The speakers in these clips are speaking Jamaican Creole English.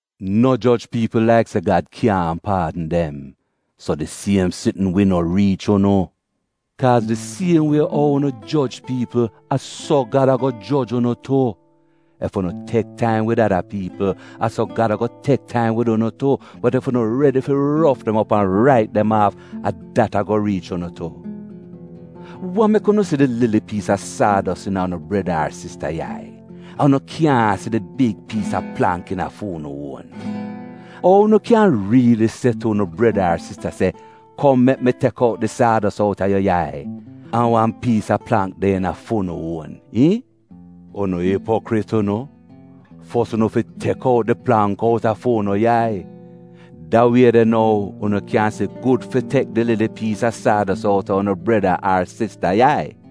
“No joj piipl laik se Gad kyaahn paadn dem, so di siem sitn wi no riich unu. Kaaz di siem wie ou unu joj piipl, a so Gad ago joj unu tu. Ef unu tek taim wid ada piipl, a so Gad ago tek taim wid unu tu, bot ef unu redi fi rof dem op an rait dem aaf, a dat ago riich unu tu. “Wa mek unu si di lili piis a saados iina unu breda ar sista yai, an unu kyaahn si di big piis a plangk iina fu'unu uon? Ou unu kyan riili se tu unu breda ar sista se, ‘Kom mek mi tek out di saados out a yu yai’ an wan piis a plangk de iina fu'unu uon, iihn? Unu ipokrit unu! Fos unu fi tek out di plangk out a fu'unu yai. Da wie de nou, unu kyan si gud fi tek di lili piis a saados out a unu breda ar sista yai.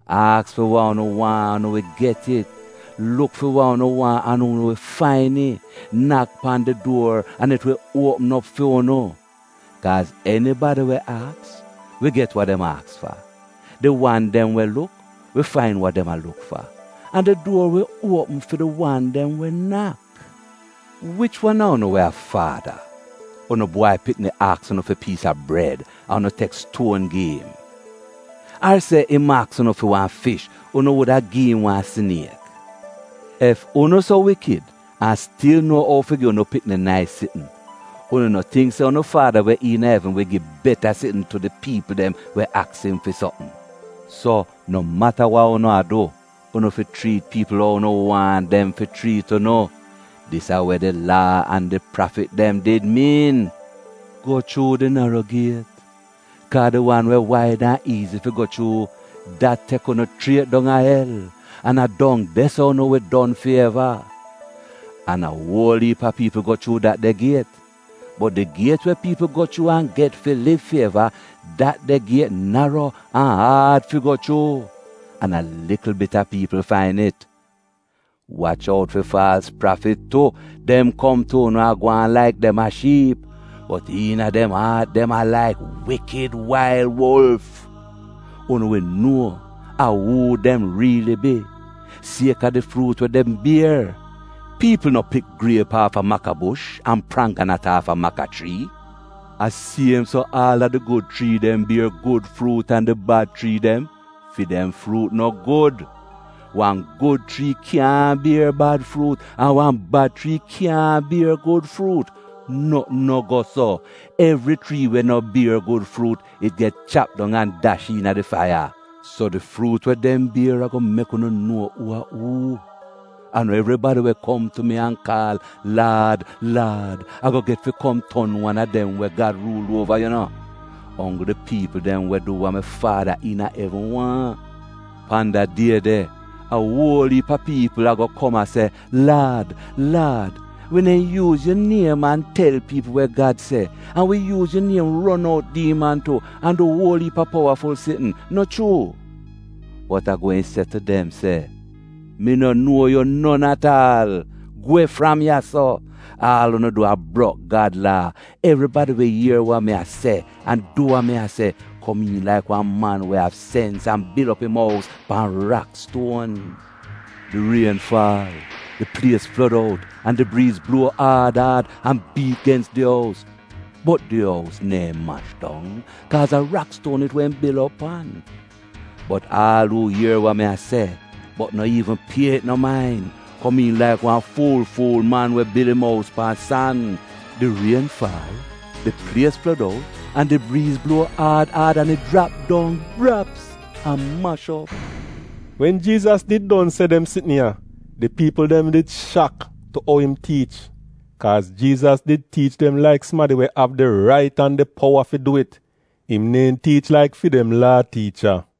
“Aks fi wa unu waahn an unu wi get it; luk fi wa unu waahn an unu wi fain it; nak pan di duor an it wi uopm op fu'unu. Kaaz enibadi we aks, wi get wa dem aks fa; di wan dem we luk, wi fain wa dem a luk fa, an di duor wi uopm fi di wan dem we nak. “Wich wan a unu we a faada, unu bwai pikni aks unu fi piis a bred an unu tek stuon gi im? Ar se im aks unu fi wan fish, unu wuda gi im wan siniek? Ef unu so wikid an stil nuo ou fi gi unu pikni nais sitn, unu no tingk se unu Faada we iina evn wi gi beta sitn tu di piipl dem we aks im fi sopm! So, no mata wa unu a du, unu fi chriit piipl ou unu waahn dem fi chriit unu. Dis a we di Laa an di prafit dem did miin. “Go chuu di naro giet, kaa di wan we waid an iizi fi go chuu dat tek unu chriet dong a el, an a dong de-so unu wi don fi eva. An a wol iip a piipl go chuu dat de giet. Bot di giet we piipl go chuu an get fi liv fi eva, dat de giet naro an aad fi go chuu. An a likl bit a piipl fain it. “Wach out fi faalz prafit tu. Dem kom tu unu a gwaan laik dem a shiip, bot iina dem aat dem a laik wikid wail wulf. Unu wi nuo a uu dem riili bi, sieka di fruut we dem bier. Piipl no pik griep aafa makabush an prangganat aafa maka chrii? A siem so aal a di gud chrii dem bier gud fruut an di bad chrii dem — fi dem fruut no gud. Wan gud chrii kyaahn bier bad fruut, an wan bad chrii kyaahn bier gud fruut. Notn no go so. Evri chrii we no bier gud fruut, it get chap dong an dash iina di faiya. So, di fruut we dem bier ago mek unu nuo uu a uu. “A no evribadi we kom tu mi an kaal ‘Laad, Laad,’ ago get fi kom ton wan a dem we Gad ruul uova yu no; onggl di piipl dem we du wa mi Faada iina evn waahn. Pan da die de, a wol iip a piipl ago kom a se, ‘Laad, Laad, wi neehn yuuz fi yu niem an tel piipl wa Gad se, an wi yuuz yu niem ron out diiman tu an du uol iip a powaful sitn, no chuu?’ Bot a gweehn se tu dem se, ‘Mi no nuo yu non at aal. Gwe fram ya-so! Aal unu du a brok Gad Laa!’ “Evribadi we ier wa mi a se, an du wa mi se, komiin laik wan man we av sens an bil op im ous pan rakstuon. Di rien faal, di plies flod out an di briiz bluo aad aad an biit gens di ous. Bot di ous neehn mash dong, kaa a rakstuon it wehn bil op pan. Bot aal uu ier wa mi a se, bot no iivn pie it no main, komiin laik wan fu-fuul man we bil fi'im ous pan san. Di rien faal, di plies flod out an di briiz bluo aad an it jrap dong — braps, an mash op.” Wen Jiizas did don se dem sitn ya, di piipl dem did shak tu ou im tiich. Kaaz Jiizas did tiich dem laik sumadi we av di rait an di powa fi du it. Im neehn tiich laik fi dem Laa tiicha.